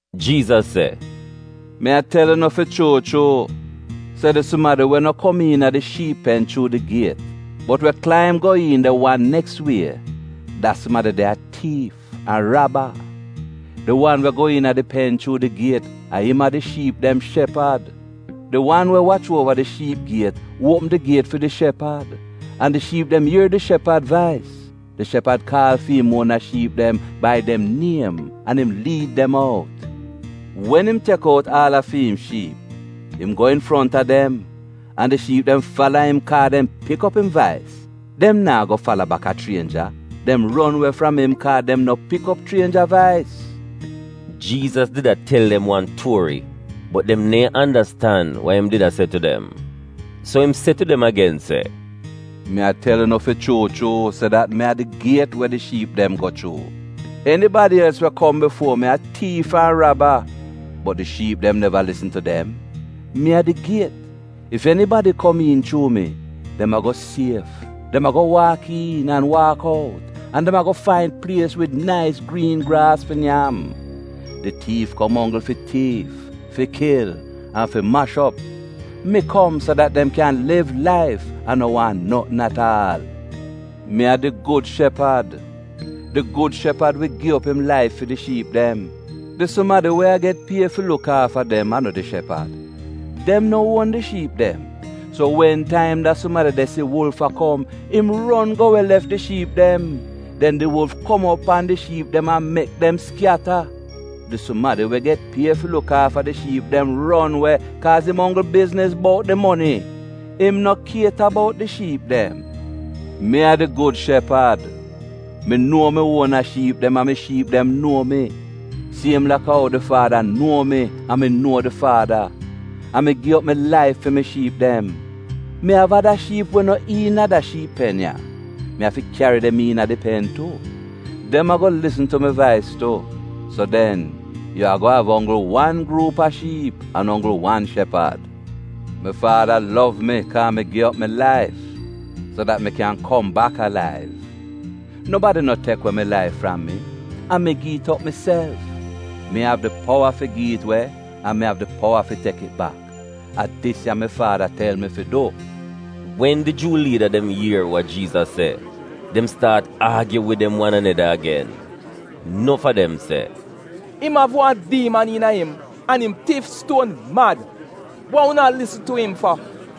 Jiizas se, “Mi a tel unu fi chuu chuu se di sumadi we no kom iina di shiip pen chuu di giet, bot we klaim go iin de wan neks wie, da sumadi de a tiif an raba. Di wan we go iina di pen chuu di giet, a im a di shiip dem shepad. Di wan we wach uova di shiip giet uopm di giet fi di shepad, an di shiip dem ier di shepad vais. Di shepad kaal fi'im uona shiip dem bai dem niem an im liid dem out. Wen im tek out aal a fi'im shiip, im go infronta dem, an di shiip dem fala im kaa dem pik op im vais. Dem naa go fala baka chrienja. Dem ron we fram im kaa dem no pik op chrienja vais.” Jiizas did a tel dem wan tuori bot dem neehn andastan wa im did a se tu dem. So im se tu dem agen se, “Mi a tel unu fi chuu chuu se dat mi a di giet we di shiip dem go chuu. Enibadi els we kom bifuo mi a tiif an raba, bot di shiip dem neva lisn tu dem. Mi a di giet. Ef enibadi kom iin chuu mi, dem ago sief. Dem ago waak iin an waak out, an dem ago fain plies wid nais griin graas fi nyam. Di tiif kom onggl fi tiif, fi kil an fi mash op. Mi kom so dat dem kyan liv laif an no waahn notn at aal. Mi a di gud shepad. Di gud shepad wi gi op im laif fi di shiip dem. Di sumadi we a get pie fi luk aafa dem a no di shepad. Dem no uon di shiip dem. So wen taim da sumadi de si wulf a kom, im ron go we lef di shiip dem. Den di wulf kom op pan di shiip dem an mek dem skyata. Di sumadi we get pie fi luk aafa di shiip dem ron we kaaz im onggl bizniz bout di moni. Im no kieta bout di shiip dem. Mi a di gud shepad. Mi nuo mi uona shiip dem an mi shiip dem nuo mi — siem laka ou di Faada nuo mi an mi nuo di Faada. An mi gi op mi laif fi mi shiip dem. Mi av ada shiip we no iina da shiip pen ya. Mi afi kyari dem iina di pen tu. Dem ago lisn tu mi vais tu, so den, yu ago av onggl wan gruup a shiip an onggl wan shepad. Mi Faada lov mi kaa mi gi op mi laif, so dat mi kyan kom bak alaiv. Nobadi no tek we mi laif fram mi. A mi gi it op miself. Mi av di powa fi gi it we an mi av di powa fi tek it bak. A dis ya mi Faada tel mi fi du.” Wen di Juu liida dem ier wa Jiizas se, dem staat aagyu wid dem wan aneda agen. Nof a dem se, “Im av wan diiman iina im an im tif stuon mad. Wa unu a lisn tu im fa?”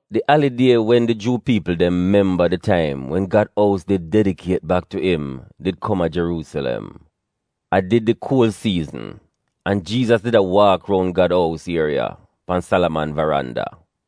Di alidie wen di Juu piipl dem memba di taim wen Gad ous did dedikiet bak tu im did kom a Jeruusilem. A did di kuol siizn, an Jiizas did a waak roun Gad ous ieriya pan Salaman varanda.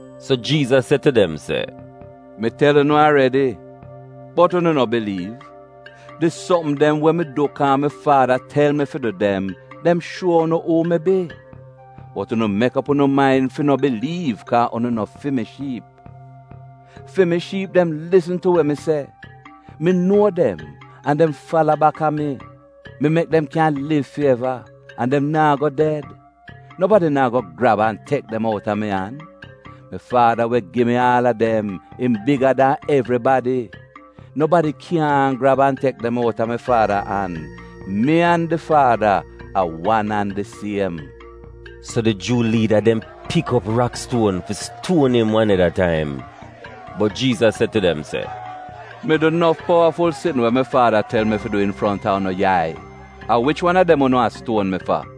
So Jiizas se tu dem se, “Mi tel unu aredi, bot unu no biliiv. Di sopm dem we mi du kaa mi Faada tel mi fi du dem, dem shuo unu uu mi bi. Bot unu mek op unu main fi no biliiv kaa unu a no fi mi shiip. Fi mi shiip dem lisn tu we mi se. Mi nuo dem, an dem fala baka mi. Mi mek dem kyan liv fi eva, an dem naa go ded. Nobadi naa go grab an tek dem outa mi an. Mi Faada we gi mi aal a dem, im biga dan evribadi. Nobadi kyaahn grab an tek dem outa mi Faada an. Mi an di Faada a wan an di siem.” So di Juu liida dem pik op rakstuon fi stuon im wan neda taim, bot Jiizas se tu dem se, “Mi du nof powaful sitn we mi Faada tel mi fi du infronta unu yai. A wich wan a dem unu a stuon mi fa?”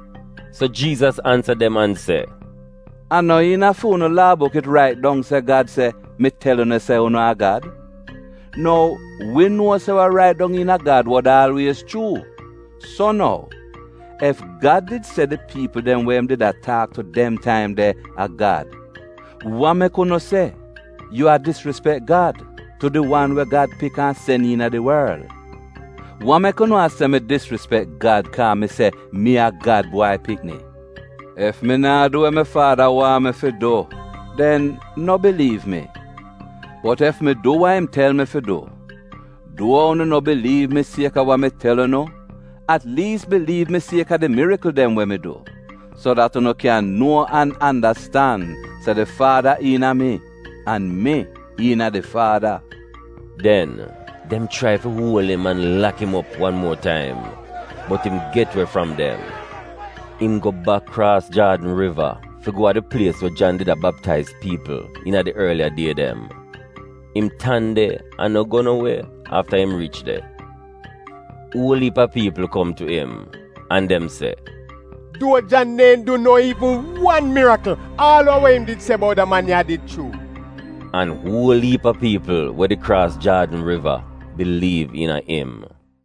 So Jiizas ansa dem an se, “A no iina Fu'unu Laa buk it rait dong se Gad se, ‘Mi tel unu se unu a gad’? Nou, wi nuo se wa rait dong iina Gad wod aalwiez chuu. So nou, ef Gad did se di piipl dem we im did a taak tu dem taim de a ‘gad,’ wa mek unu se, ‘Yu a disrispek Gad,’ tu di wan we Gad pik an sen iina di worl? Wa mek unu a se mi disrispek Gad kaa mi se, ‘Mi a Gad Bwai Pikni’? Ef mi naa du we mi Faada wan mi fi du, den no biliiv mi. Bot ef mi du wa im tel mi fi du, duo unu no biliiv mi kaaz a wa mi tel unu, at liis biliiv mi kaaz a di mirikl dem we mi du, so dat unu kyan nuo an andastan se di Faada iina mi, an mi iina di Faada.” Den, dem chrai fi uol im an lak im op wan muo taim, bot im get we fram dem. Im go bak kraas Jaadn Riva fi go a di plies we Jan did a baptaiz piipl iina di orliya die dem. Im tan de an no go no we afta im riich de. Uol iip a piipl kom tu im, an dem se, “Duo Jan neehn du no iivn wan mirikl, aal a we im did se bout da man ya a did chuu.” An uol iip a piipl we did de kraas Jaadn Riva biliiv iina im.